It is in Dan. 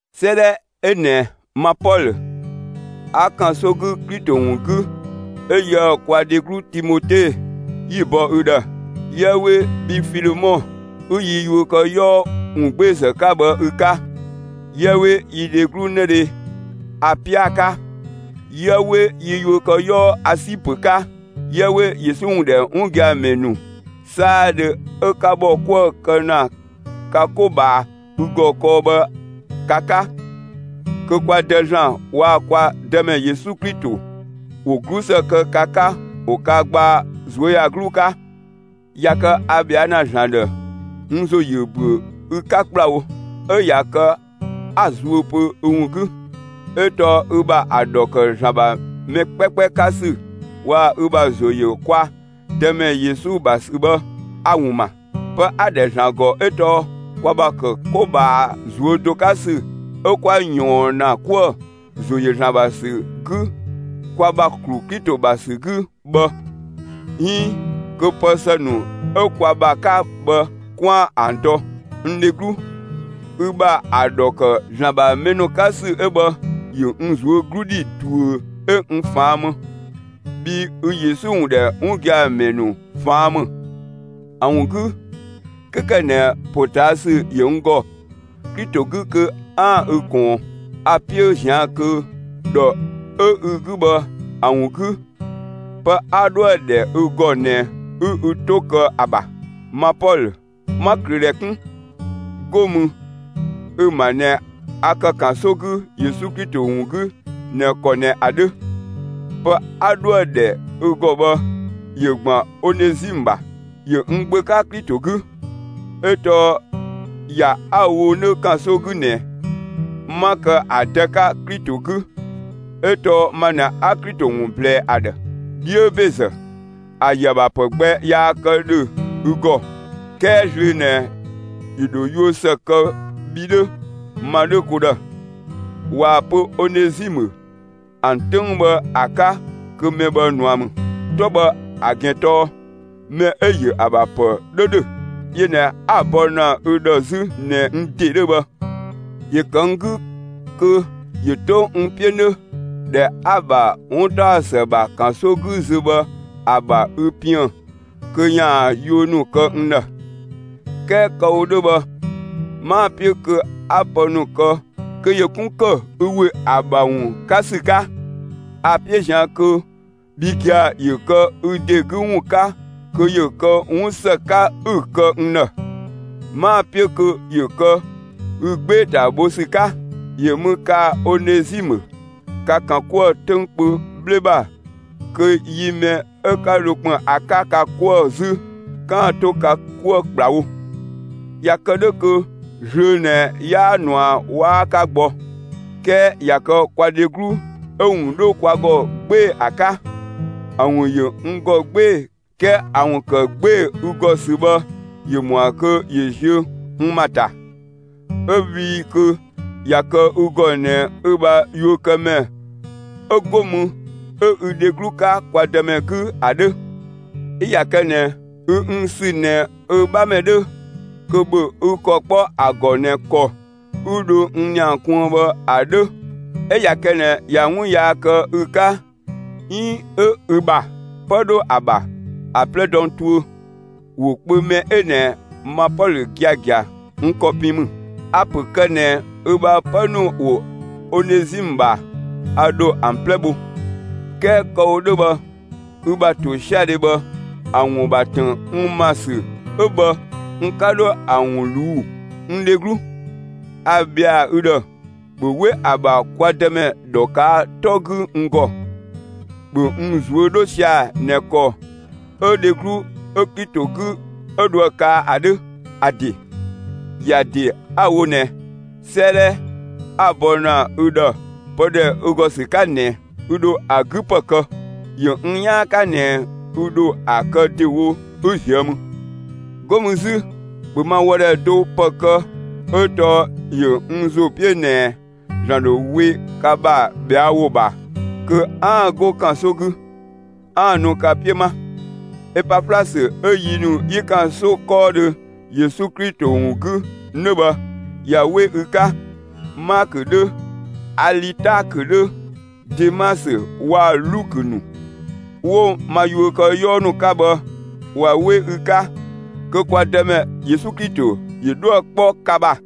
'Sëëdhɛ 'ö ꞊nɛ ma Pɔlö 'a ‑kanso 'gü Klito ‑wun 'gü, 'ö yië‑ kwa dheglu Timote 'yi‑ bɔ ü ‑dhë. 'Yië 'we bhi Filemɔ, 'ü yi yuökëyɔɔ ‑wungbeezë 'ka bhë ü 'ka; 'yië 'we yi dheglu 'nëdhe Apia 'ka; 'yië 'we yi yuökëyɔɔ Asipö 'ka; 'yië 'we Yesu ‑wun ‑dhɛ 'wun gia‑ ‑mɛ ‑nu 'saadhö 'ö 'ka ‑bhɔ 'kuë‑ kë ‑na ka 'ko ꞊bhaa ü ‑gɔ kɔɔ bhë ka 'ka. Kö kwa Dë ‑Zlan waa‑ kwa Dëmɛ Yesu Klito ‑wo 'glusë kë ka 'ka ‑wo ka gbaa ꞊zuöyagluu 'ka. ꞊Ya kë a ꞊bhɛa' ‑na ‑Zlan ‑dhë, n ‑zo ‑yö ‑büö ü 'ka ‑kplawo, 'ö ꞊ya kë 'a‑ zuö pö ü ‑wun 'gü. 'Ö tɔɔ ü ‑bha ‑a ‑dhɔ ‑kë ‑Zlan ‑bha mɛ 'kpɛkpɛ 'ka ‑sü waa‑ ü ‑bha ‑zo ‑yö kwa Dëmɛ Yesu ‑bha ‑sü bhë, a‑ ‑wun ‑ma. Pë 'a‑ ‑dhɛ ‑Zlan ‑gɔ 'ö tɔɔ kwa ‑bha ‑kë 'ko ꞊bhaa ꞊zuö' do 'ka ‑sü 'ö kwa ꞊yɔɔn ‑na 'kuë‑ ‑zo ‑yö ‑Zlan ‑bha ‑sü 'gü kwa ‑bha ‑klu Klito ‑bha ‑sü 'gü bhë, 'iin kö pë ‑së ‑nu 'ö kwa ‑bha 'ka bhë 'kwaan‑ ‑an dɔ. N dheglu, ü ‑bha ‑a ‑dhɔ ‑kë ‑Zlan ‑bha mɛ ‑nu 'ka ‑sü 'ö bhë, ‑yö n ꞊zuö' 'glu ‑dhi ꞊duö 'ö n ꞊faan' më, bhii ü Yesu ‑wun ‑dhɛ 'wun gia‑ ‑mɛ ‑nu ꞊faan' ‑më. ‑A ‑wun 'gü, 'kö ‑kë ꞊nɛ ‑potaasü ‑yö n ‑gɔ Klito 'gü kö 'aan‑ ü ꞊kɔɔn, a‑ 'piö ꞊zian' kö ‑dhɔ 'ö ü 'gü bhë ‑a ‑wun 'gü, pë 'a 'dhoë‑ ‑dhɛ ü ‑gɔ ꞊nɛ 'ü ü 'to kë ‑a ‑bha. Ma Pɔlö, 'ma ꞊klöödhɛ 'kun, 'go mü ü‑ ‑ma ꞊nɛ a ‑kë ‑kanso 'gü Yesu Klito ‑wun 'gü ꞊nɛ ‑kɔ ꞊nɛ ‑a 'dhö. Pë 'a 'dhoë‑ ‑dhɛ ü ‑gɔ bhë ‑yö ‑gban Onezimë ‑bha. ‑Yö n gbö 'ka Klito 'gü, 'ö tɔɔ ‑ya 'a‑ wo 'nö ‑kanso 'gü ꞊nɛ, 'ma kë ‑a dë 'ka Klito 'gü ('ö tɔɔ ma ꞊nɛ 'a Klito ‑wun ꞊blɛɛ ‑a ‑dhë). 'Dhiö ‑bezë, ‑a ‑yö ‑a ‑bha ‑pë gbɛ yaa kë ‑dhö ü ‑gɔ; 'kɛɛ zlöö ꞊nɛ ‑yö ‑dho yuö ‑së kë bhi 'dhö, ma 'dhö, ko ‑dhë. (꞊Waa‑ pö Onezimë ‑an 'töng bhë ‑a 'ka kö mɛ bhë ꞊nua ‑mü. 'Tɔ bhë ‑a ‑gɛn tɔɔ mɛ 'ö‑ ‑yö ‑a ‑bha ‑pë 'dhö ‑dhö.) Yö ꞊nɛ 'a‑ bɔ ‑na ü ‑dhë 'zü ꞊nɛ n ‑de 'dhö bhë. ‑Yö ‑kë n 'gü kö ‑yö 'to n 'piö 'nö, ‑dhɛ 'a‑ ‑bha 'wuntaɔsë ‑bha ‑kanso 'gü zö bhë ‑a ‑bha ü piën‑ kö ‑yaan yuö ‑nu kë n ‑dhë. 'Kɛɛ kë‑ wo 'dhö bhë 'maa‑ 'piö kö 'a pë ‑nu kë kö ‑yö 'kun ‑kë ü ‑we ‑a ‑bha ‑wun 'ka ‑sü 'ka. A‑ 'piö ꞊zian' kö bhi gia‑, ‑yö kë ü ‑de 'gü ‑wun 'ka kö ‑yö kë 'wun ‑së 'ka 'ü‑ kë n ‑dhë. 'Maa‑ 'piö kö ‑yö kë ü 'gbee‑ ‑ta bho ‑sü 'ka. ‑Yö mü kaa‑ Onezimë ka ‑kan 'kuë‑ 'töng kpö 'bhle ‑bha kö yi mɛ 'ö 'ka dho ‑kpën ‑a 'ka ka 'kuë‑ 'zü, 'kaan‑ 'to ka 'kuë‑ ‑kplawo, ꞊ya kë 'dhö kö zlöö ꞊nɛ 'yaa ꞊nua 'waa 'ka gbɔ; 'kɛɛ ꞊ya kë kwa dheglu 'ö‑ ‑wun 'dhö kwa ‑gɔ 'gbee‑ ‑a 'ka. ‑A ‑wun ‑yö n ‑gɔ 'gbee‑; 'kɛɛ ‑a ‑wun ‑kë 'gbee‑ ü ‑gɔ ‑sü bhë ‑yö ‑mɔa kö ‑yö ziö n ‑ma ‑ta, 'ö bhii kö ꞊ya kë ü ‑gɔ ꞊nɛ ü ‑bha yuökëmɛ 'ö 'go mü 'ö ü dheglu 'ka kwa Dëmɛ 'gü ‑a 'dhö. 'Ö ꞊ya kë ꞊nɛ ü n ‑sü ꞊nɛ ü 'bhamɛ 'dhö, kö ‑bhö ü ‑kɔ 'kpɔ ‑a ‑gɔ ꞊nɛ ‑kɔ 'ü dhö n ‑nia kuën bhë ‑a 'dhö. 'Ö ꞊ya kë ꞊nɛ ꞊ya 'wun yaa kë ü 'ka 'iin 'ö ü ‑bha 'pë 'dhö ‑a ‑bha, ‑a 'plɛ dɔ n tuö. ‑Wo kpö mɛ 'ö ꞊nɛ, ma Pɔlö giagia, n ‑kɔ pin ‑mü; a‑ ‑pö ‑kë ꞊nɛ ü ‑bha 'pë ‑nu ‑wo Onezimë ‑bha, a ‑dho ‑an 'plɛ bho. ('Kɛɛ kë‑ wo 'dhö bhë, ü ‑bha ‑tosiadhe bhë, ‑a ‑wun ‑bha ‑tën n ‑ma ‑sü 'ö bhë, n 'ka dho ‑a ‑wun ꞊luu'‑.) N dheglu, a ‑bhɛa ü ‑dhë, ‑bhö 'we ‑a ‑bha kwa Dëmɛ ‑dhɔ ꞊kaa' 'tɔ 'gü n ‑gɔ; ‑bhö n ꞊zuö' 'dho sia‑ ꞊nɛ ‑kɔ 'ö dheglu 'ö Klito 'gü 'ö dhoë‑ kaa ‑a 'dhö. ‑A ‑de, ‑ya ‑de 'a‑ wo ꞊nɛ, 'sëëdhɛ 'a‑ bɔ ‑na ü ‑dhë pë ‑dhɛ ü ‑gɔ ‑sü 'ka ꞊nɛ, ü ‑dho ‑a 'gü ‑pë kë. ‑Yö n 'yaan 'ka ꞊nɛ ü ‑dho ‑a kë ‑dewo 'ö ꞊zië' mü. 'Go mü 'zü, ‑bhö ma wɔdhɛ do ‑pë kë 'ö tɔɔ ‑yö n ‑zo 'piö ꞊nɛ ‑Zlan ‑dho we ka ‑bha ꞊bhɛa' ‑wo ‑bha kö 'aan‑ 'go ‑kanso 'gü, 'aan‑ nu ka 'piö 'ma. Epaflasö 'ö yi ‑nu 'yi ‑kanso 'kɔɔdhö Yesu Klito ‑wun 'gü 'nö bhë ꞊ya 'we ü 'ka. Maakö 'dhö, Alitaakö 'dhö, Demasö waa‑ Lukö ‑nu 'wo ma yuökëyɔɔ ‑nu 'ka bhë, ꞊wa 'we ü 'ka. Kö kwa Dëmɛ Yesu Klito ‑yö 'dhuë‑ 'kpɔ ka ‑bha!